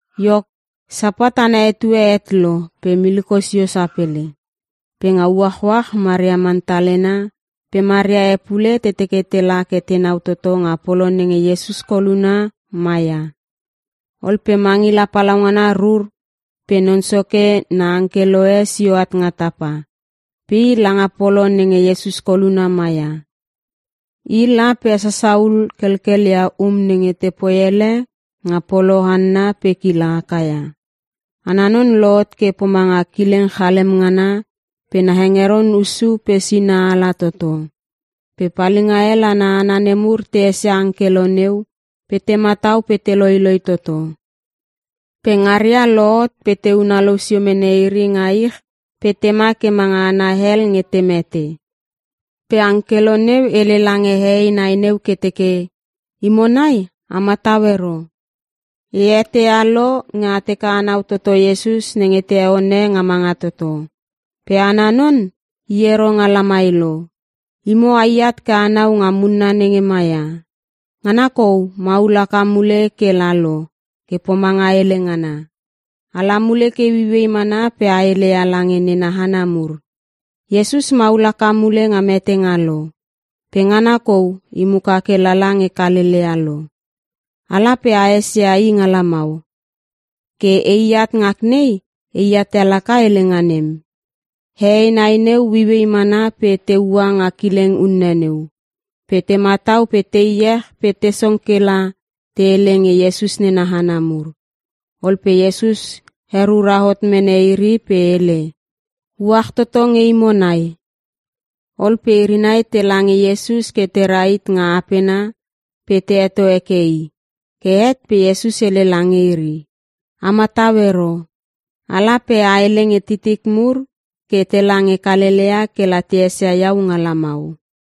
Iok, Sapat ana etue het lo pe miliko sio sapele. Pe nga uachuach Maria Mantalena pe Maria e pule te teke tela ke tenau toto nga polo nenge Iesus koluna ma ia. Ol pe mangila palaungana rur pe Non Soke na angkelo e sio at nga tapa, pe i langa polo nenge Iesus koluna ma ia. I la pe hesasa hul kelkelia um nenge te poi ele nga polo hanna pe kila haka ia. Ana non lohot ke pomanga kileng chalem ngana pe na hengeron hussu pe sina ala toto. Pe palinga hel ana hana nemur te esia angkelo neu pe te matau pe te loiloi toto. Pe ngaria lohot pe te unalou sio mene iri nga ich pe tema ke manga hana hel nge te mete. Pe angkelo neu hele lange hehei nai neu ke teke, “Imo nai a matau ero. E eteia lo nge a teke anau toto Iesus nenge te heone nga manga toto. Pe ana non, i ero nga lamai lo. Imo a iat ke anau nga munna nenge maia. Ngana kou maul haka mule ke lalo ke pomanga hele ngana. Ala mule ke ueiuei mana pe a hele ia lange nena hana mur: ‘Iesus maul haka mule nga metenga lo. Pe ngana kou i muka ke lala nge Kalelea lo. Ala pe a esia I nga lamau.’ Ke e at ngak nei, e at ia laka helenga nem.” Hehei nai neu ueiuei mana pe te ua nga kileng unne neu. Pe te matau pe te iech pe te song kela te hele nge Iesus nena hana mur. Ol pe Iesus herura hot mene iri pe hele, “Uach toto nge imo nai.” Ol pe iri nai tela nge Iesus ke te rahit nga apena pe te heto heke I. Ke het pe Iesus hele lange iri, “A matau ero. Ala pe a hele nge titik mur ke tela nge Kalelea, kela te esia Iau nga lamau.”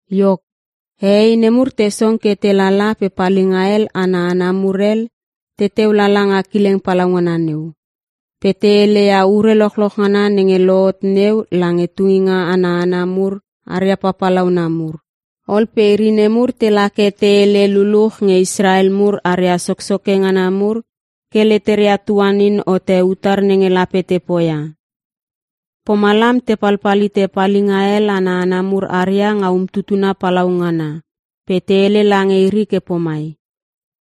Iok, hehei ne mur te song ke te lala pe palinga hel ana hana mur hel, teteu lala nga kileng palaungana neu. Pe te hele ia ure lochloch ngana nenge lohot neu lange tunginga ana hana mur aria papalauna mur. Ol pe iri nemur tela ke te hele luluch nge Israel mur aria soksoke ngana mur ke leteria tuanin hote utar nenge lape te poia. Pomalam te palpal hite palinga hel ana hana mur haria nga umtutuna palaungana pe te hele lange iri ke pomai,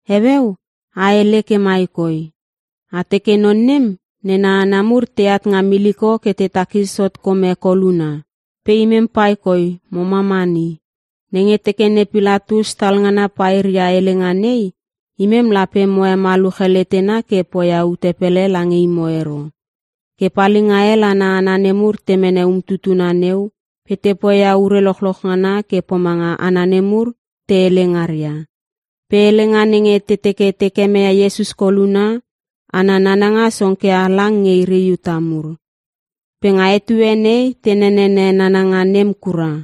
“Heueu a hele ke mai koi. A teke, ‘Non nem, nena hana mur teat nga miliko ke te takis hot kome koluna. Pe imem paikoi mo mamani.’ Nenge teke ne Pilatus talngana pairia helenga nei, imem lape mo hemaluche letena ke poia ute pele lange imo ero.” Ke palinga hel ana hana nemur te mene umtutuna neu pe te poia ure lochloch ngana ke pomanga hana nemur te hele ngaria. Pe helenga nenge te teke te kemeia Iesus koluna, ana nananga song ke halang nge iri Iuta mur. Pe nga etue nei te nenene nananga nem kura.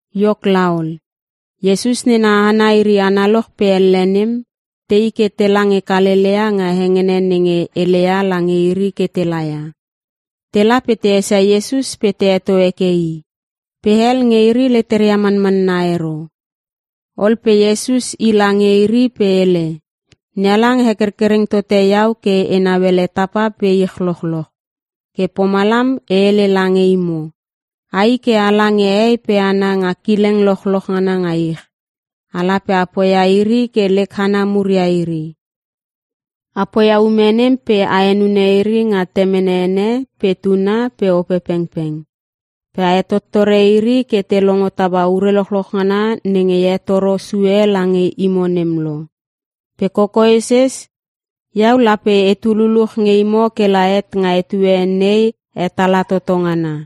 Iok laol, Iesus nena hana iri analoch pe elle nem, tei ke tela nge Kalelea nga hengene nenge hele ia lange iri ke telaia. Te la pe te esia Iesus pe te heto heke I, pe hel nge iri leteria manmanna ero. Ol pe Iesus i lange iri pe hele, “NeHalang hekerkereng tote iau ke enau ele tapa pe ich lochloch. Ke pomalam e hele lange imo, ai ke ala nge hehei pe hana nga kileng lochloch ngana nga ich. Ala pe a poia iri ke lek hana mur ia iri. A poia ume nem pe a henune iri nga Temene ene pe Tuna pe Opepengpeng. Pe a hetottore iri ke te longo taua ure lochloch ngana nenge e hetoro sue lange imo nem lo. Pe kokoeses, Iau lape etu luluch nge imo kela het nga etue nei hetala toto ngana.”